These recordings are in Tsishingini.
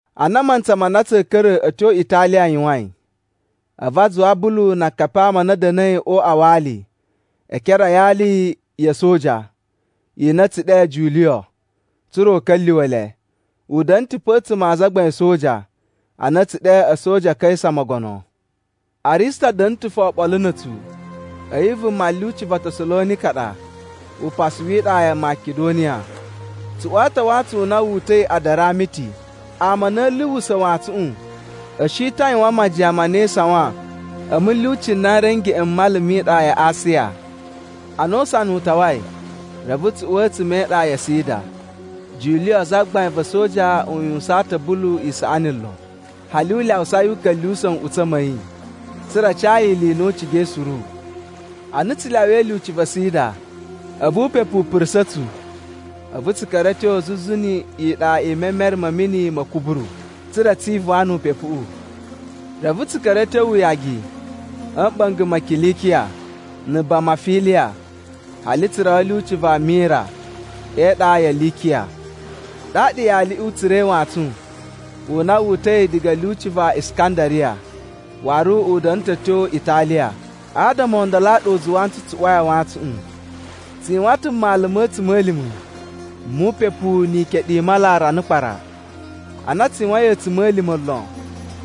Ana mantsa ma na tsa̱a̱ ka̱ra̱ a̱ tyo Italiya yuwain, a̱vu a zuwa Bulu na akapi a ama a na a̱ da̱na̱i o uꞌwa wa ali e ekere a yali ya̱ a̱soja i na a̱ tsu ɗe Juliyo tsa̱ra̱ u ka̱lyuwa̱ le. U da̱na̱ ta̱ pe a̱tsuma̱ a azagbain a̱ a̱soja a na a̱ tsu ɗe A̱soja a Kaisa Mogono. Arista da̱na̱ ta̱ fo oɓolo na̱ a̱tsu. A̱yi vuma lyuci va Tasalonika ɗa upasu wi iɗa ya Makidoniya. Tsu uwa ta̱ wantsun u na wu uta̱i Adaramiti. Ama a na a̱ luwusa̱ wantsuꞌun a̱ shi ta̱ a yuwan majiyan ma na e isawan a̱ mulyuci n na n ri a̱ ngeꞌen m mala mi iɗa ya Asiya. Ana usana u tawai, reve tsu uwa a̱tsuma̱ e iɗa ya Sida. Juliyo zagbain va̱ a̱soja u yuwusaan ta̱ Bulu isaꞌani lon. Hali u lyawusa yi u ka̱lyuwusa̱ nꞌutsa̱ ma̱ yi, tsa̱ra̱ a ca yi ili i na u cigai suru. Ana tsu lyawai lyuci va Sida a̱vu upepu u purusa̱ tsu, a̱vu tsu ka̱ra̱ a̱ tyo zuzu ni iɗa i memere ma̱ mini ma̱ Kuburu, tsa̱ra̱ tsi ivuwan nu upepuꞌu. Reve tsu ka̱ra̱ a̱ tyo uyagi a̱ mɓa̱nga̱ ma Kilikiya na̱ Bamafiliya, hali tsu rawa a̱ lyuci va Mira e iɗa ya Likiya. Ɗaɗa yaliꞌi u tsura̱i wantsun u na wu uta̱i diga a̱ lyuci va Iskandariya waru u da̱na̱ ta̱ a̱ tyo Italiya. Adama o ndolo a ɗa u zuwa ntsu, tsu uwai a wantsuꞌun. Tsu yuwan ta̱ mmalu ma̱ a̱tsuma̱lima̱ mu upepu ni ikeɗu i mala rana kpara. Ana tsu yuwain a̱tsuma̱lima̱ lon,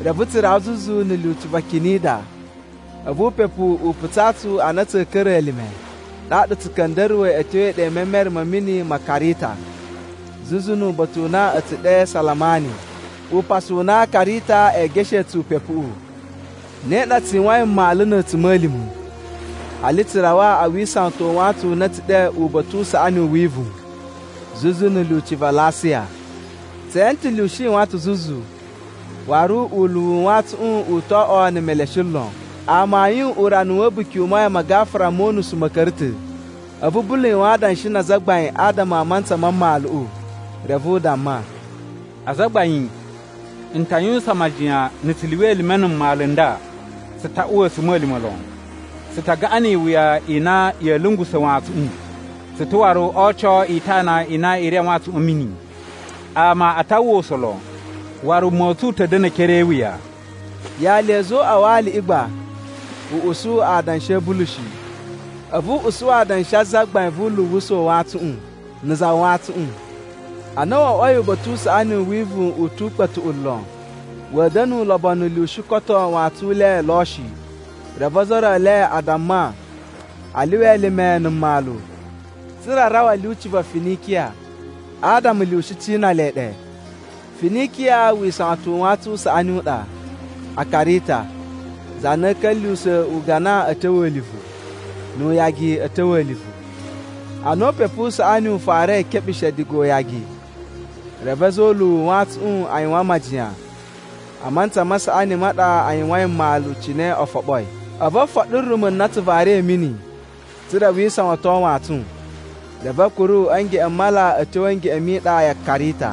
reve tsu rawa zuzu na̱ lyuci va Kinida. A̱vu upepu u putsaa tsu a na tsa̱a̱ ka̱ra̱ elime. Ɗaɗa tsu ka̱nda̱ruwa̱i a̱ tyo e iɗa i memere ma̱ mini ma Karita zuzu nu uba̱ta̱ u na a̱ tsu ɗe Salamani, upasu u na Karita ee geshee tsu upepuꞌu. Ne ɗa tsu yuwain mmalu na̱ a̱tsuma̱lima̱ hali tsu rawa a wisawatan u wantsun u na a̱ tsu ɗe Uba̱ta̱ u Saꞌani u Wivuwun, zuzu na̱ lyuci va Lasiya. Tse ene ta̱ lyushi yuwan ta̱ zuzu, waru uluwu u wantsuꞌun u to oꞌwo na̱ meleshe lon. Amayun urana wa̱ A̱buki u Mayan ma Gafura mo Unusu ma̱ ka̱ra̱ ta̱. A̱vu Bulu yuwan adanshi na azagbain adama a mantsa ma mmaluꞌu. Reve u damma, “Azagbain, n ta yuwusan majiyan na̱ tsu lyuwa elime na̱ mmalu n nda tsu ta uwa a̱tsuma̱lima̱ lon. Tsu ta gaꞌan ni iwuya i na ya̱a̱ lungusa̱ wantsuꞌun. Tsu ta̱ waru o oco itana i na i ri a wantsuꞌun a̱ mini. Ama a ta uwwa usa̱n lon, waru wuma u tsu u ta̱ da̱na̱ e ekere e iwuya.” Yali ya̱ a̱za̱ o uꞌwa wa aliꞌi gba u usu adanshi a̱ Bulu shi, a̱vu u usu adanshi a zagbain vu uluwusa̱ u wantsuꞌun na̱ za wantsuꞌun. Ana wo oꞌwoi Uba̱ta̱ u Saꞌani u Wivuwun u tu ukpa̱tuꞌu lon, wa̱a̱ da̱na̱ ulobonu lyushi koto wantsun u le lo shi. Reve ozo o ro e le a damma a lyuwa elime na̱ mmalu, tsa̱ra̱ a rawa a̱ lyuci va Finikiya, adama lyushi cina le ɗe. Finikiya wisawatan u wantsun u saꞌani u ɗa a Karita, za na a̱ ka̱lyuwusa̱ ugana a̱ tyo a̱livu nu uyagi a̱ tyo a̱livu. Ana upepu u saꞌani u farai e keɓushe diga uyagi, reve a̱za̱ o uluwu u wantsuꞌun a yuwan majiyan a mantsa ma saꞌani ma ɗa a yuwain mmalu cine o foɓoi. A̱vu o foɗo rumu na a tsu vari a̱ mini tsa̱ra̱ wi isawaton wantsun, reve a̱ kuru a̱ ngeꞌen m mala a̱ tyo a̱ ngeꞌen mi iɗa ya Karita.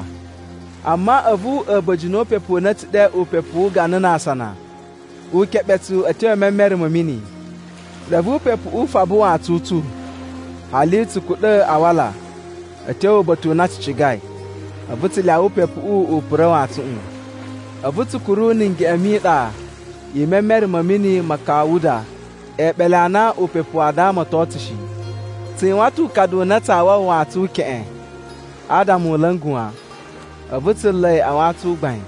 Amma a̱vu a̱ba̱jini o upepu u na a̱ tsu ɗe “Upepu wu Ugana na Asana” u keɓe tsu a̱ tyo e memere ma̱ mini. Reve upepuꞌu u faba wantsun u tsu, hali tsu kuɗa̱ a wala a̱ tyo uba̱ta̱ u na tsu cigai. A̱vu tsu lyawa upepuꞌu u pura̱ wantsuꞌun. A̱vu tsu kuru na̱ ngeꞌen mi iɗa i memere ma̱ mini ma Kawuda e eɓele a na upepu waa damaton tsu shi. Tsu yuwan ta̱ ukadu u na tsaa wawa wantsun u keꞌen adama u la̱nga̱ wan. A̱vu tsu nla̱ yi a wantsun u gbain.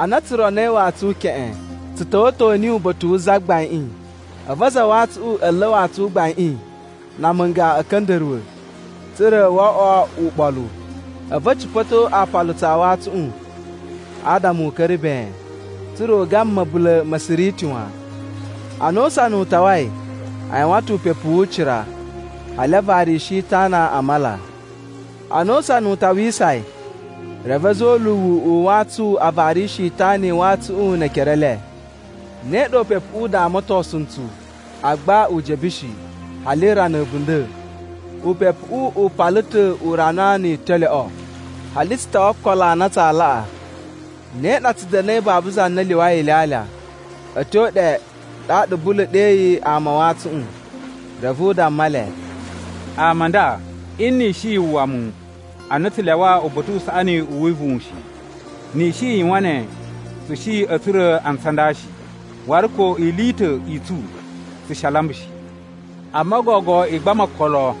Ana tsu ronoi wantsun u keꞌen, tsu ta̱wa̱to niyi uba̱ta̱ wu zagbaiꞌin, a̱vu aza a wantsuꞌun a̱ nla̱ wantsun u gbaiꞌin na amunga a̱ka̱nda̱ruwa̱, tsa̱ra̱ wo oꞌwo uɓolu. A̱vu a̱ cipa̱to aapalutsu a wantsuꞌun adama u ka̱ra̱ ben, tsa̱ra̱ u gama ma̱bula̱ ma Siriti wan. Ana usana u tawai, a yuwan ta̱ upepu wu ucira, hali a varishi itana a mala. Ana usana u tawisai, reve a̱za̱ o uluwu u wantsun a varishi itana i wantsuꞌun ne ekere e le. Ne ɗa upepuꞌu u damatosun ntsu, agba u jebe shi, hali rana a̱bunda̱. Upepuꞌu u pala ta̱ urana ni italyoꞌo, hali tsu tawa okolo a na tsaa laꞌa. Ne ɗa tsu da̱na̱i babu za na lyuwai ilyalya. A̱ tyo ɗe ɗaɗa Bulu ɗeyi ama a wantsuꞌun, reve u damma le, “Ama a nda, nni i shi yu uwwa mu a na tsu lyawa Uba̱ta̱ u Saꞌani u Wivuwun shi. Ni i shi i yuwan ne, tsu shi a̱ tsura̱ antsu a nda shi, waru ko ili i ta̱ i tsu tsu shi a lamba shi. Amma gogo i gbama okolo,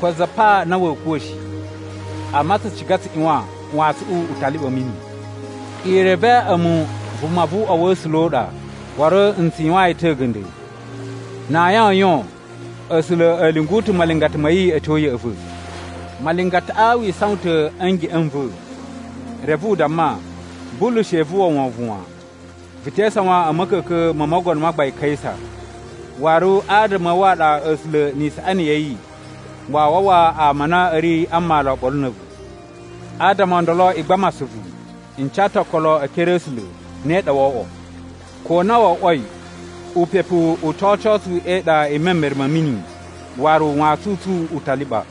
ko za pa na wa̱a̱ kuwa̱ shi, amma tsu ciga tsu ꞌyuwan wantsuꞌun u ta liɓa a̱ mini. I reve a̱mu vuma vu uꞌwa wa̱ A̱sula̱ u ɗa, waru n tsu yuwaan yi ta̱ a̱ga̱nda̱. Na ayin o yon, A̱sula̱ a̱ lyungu ta̱ malingata ma̱ yi a̱ tyo ya̱ꞌa̱ va̱. Malingataꞌa wi isawan ta̱ a̱ ngeꞌen n va̱, reve u damma, ‘Bulu she vu uwwa wovon wan! Vu te isawan a̱ ma̱ka̱ka̱n mo mogono ma gbain Kaisa. Waru adama a̱ wu a ɗa A̱sula̱ ni isaꞌani ya̱ yi waa wawa ama a na a̱ ri a mmalu oɓolo na̱ a̱vu.’ Adama o ndolo i gbama asuvu! N ca ta̱ okolo e ekere a̱ A̱sula̱, ne ɗa woo oꞌwo. Ko na wo oꞌwoi, upepu u to oco tsu e iɗa i memere ma̱ mini waru wantsun u tsu u ta liɓa.”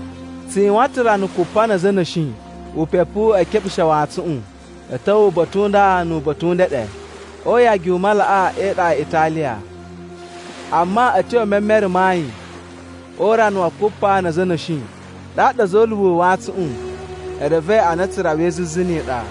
Tsu yuwan ta̱ rana kupa na̱ a̱za̱ a̱ na̱shi upepuꞌu e keɓushe wantsuꞌun a̱ ta̱wa̱ uba̱ta̱ u nda nu uba̱ta̱ u ndeɗe o uyagi u malaꞌa e iɗa ya Italiya. Amma a̱ tyo e memere ma ayin o urana wa kupa na̱ a̱za̱ a̱ na̱shi, ɗaɗa a̱za̱ o uluwu u wantsuꞌun e revei a na tsu rawai zuzu ni iɗa.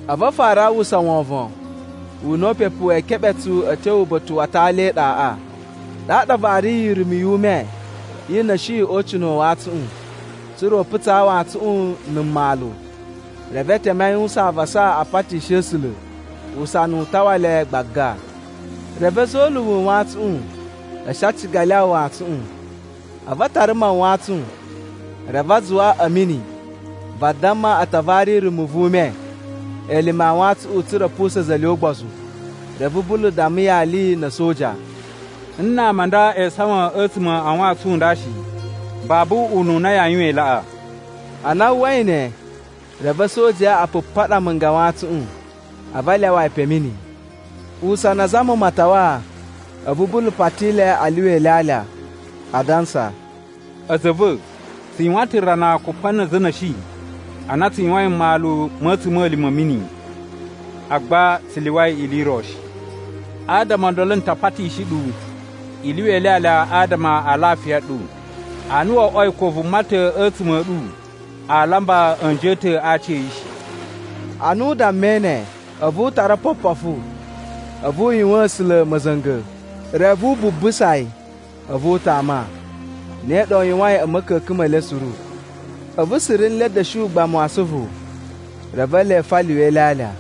A̱vu a fara a uwwusa wovon u na upepu wee keɓe tsu a̱ tyo uba̱ta̱ wa atali e iɗaꞌa. Ɗaɗa a variyi irumu yu ume i na̱shi o ucina̱ u wantsuꞌun, tsa̱ra̱ u putsaa wantsuꞌun na̱ mmalu. Reve e teme a yuwusan avasa a patishi A̱sula̱ usana u tawa le gbaga. Reve a̱za̱ o uluwu u wantsuꞌun a̱ shi a ciga a lyawa wantsuꞌun. A̱vu a tara mawantsun, reve a zuwa a̱ mini vadamma a ta vari rumu vu ume elime a wantsuꞌun tsa̱ra̱ a̱ pusa̱a̱n a̱za̱ e le ugbozu. Reve Bulu damma yali na̱ a̱soja, “Nna̱ ama a nda e isawan a̱tsuma̱ a wantsun u nda shi, babu ununa yaa yuwan i laꞌa.” Ana a uwwai ne, reve a̱sojaꞌa a pupaɗa amunga a mawantsuꞌun, a̱vu a lyawa yi pe a̱ mini. Usana azama matawa, a̱vu Bulu pati le a lyuwa ilyalya, adansa, “A̱za̱ a̱ va̱, tsu yuwan ta̱ rana kupa na̱ a̱za̱ a̱ na̱shi a na tsu yuwain mmalu ma̱ a̱tsuma̱lima̱ a̱ mini, agba tsu lyuwai ili i ro shi. Adama o ndolo n ta patishi ɗu i lyuwa ilyalya adama a lafiya ɗu, ana wo oꞌwoi ko vuma ta̱ a̱tsuma̱ a̱ ɗu aa lamba a̱nji a̱ ta̱ a aaci a̱ yi shi.” Ana u dammai ne, a̱vu u tara opopofu, a̱vu u yuwaan A̱sula̱ ma̱za̱nga̱, reve wu bubusa yi, a̱vu u tama. Ne ɗa u yuwain a̱ ma̱ka̱ka̱n me le suru. A̱vu suru nle a̱ da̱shi ugbamu wa asuvu, reve ele fo a lyuwa ilyalya.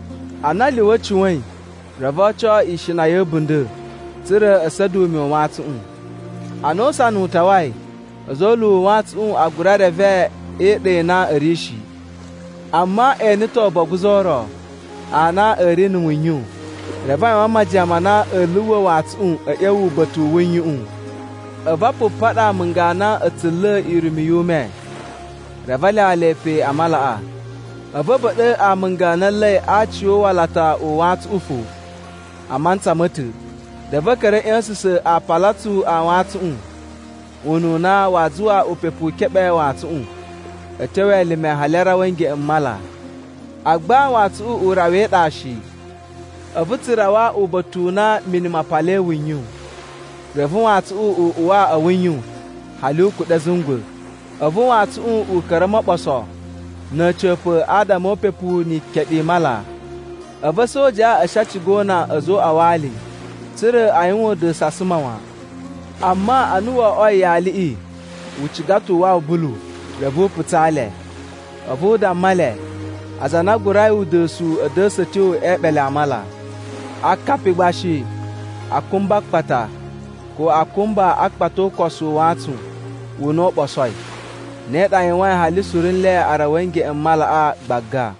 Ana a lyuwa a̱ cuwa̱in, reve o oco ishina ya̱ a̱bunda̱ tsa̱ra̱ a̱ sa̱da̱ ume u wantsuꞌun. Ana usana u tawai, a̱za̱ o uluwu u wantsuꞌun a gura reve e iɗa i na a̱ ri shi. Amma e ene ta̱ oboguzu o ro a na a̱ ri na̱ wuyun. Reve a yuwan majiyan ma na a̱a̱ luwa̱ wantsuꞌun a̱ ꞌya̱wa̱ uba̱ta̱ u wuyuꞌun. A̱vu a pupaɗa amunga a na a̱ tsu nla̱a̱ irumu yu ume, reve a lyawa le pe a malaꞌa. A̱vu a̱ ba̱ɗa̱ amunga a na a̱ nla̱i aaci o uwalata u wantsuꞌun fo a mantsa ma̱ ta̱. Reve a̱ ka̱ra̱ a̱ ꞌya̱sa̱sa̱n aapalutsu a wantsuꞌun ununa waa zuwa upepu u keɓe wantsuꞌun a̱ tyo elime hali a rawa a̱ ngeꞌen m mala. Agba wantsuꞌun u rawa e iɗa shi, a̱vu tsu rawa uba̱ta̱ u na mini ma palai wuyun, reve wantsuꞌun u uwa a̱ wuyuꞌun hali u kuɗa̱ a̱ zungwa̱. A̱vu wantsuꞌun u ka̱ra̱ o moɓoso na̱ a̱ca̱pa̱ adama o upepu ni ikeɗu i mala. A̱vu a̱sojaꞌa a̱ shi a ciga o una a̱za̱ o uꞌwa wa ali, tsa̱ra̱ a yuwan uda̱su a suma wan. Amma ana wo oꞌwoi yaliꞌi u ciga ta̱ u wawa Bulu, reve u putsaa le. A̱vu u damma le aza a na a gurai uda̱su a̱ da̱sa̱ a̱ tyo e eɓele a mala. Akapi gba shi a kumba a akpata, ko a kumba akpata o ukosu u wantsun u na wu ɓosoi. Ne ɗa a yuwain hali suru nle a rawai a̱ ngeꞌen m malaꞌa gbaga.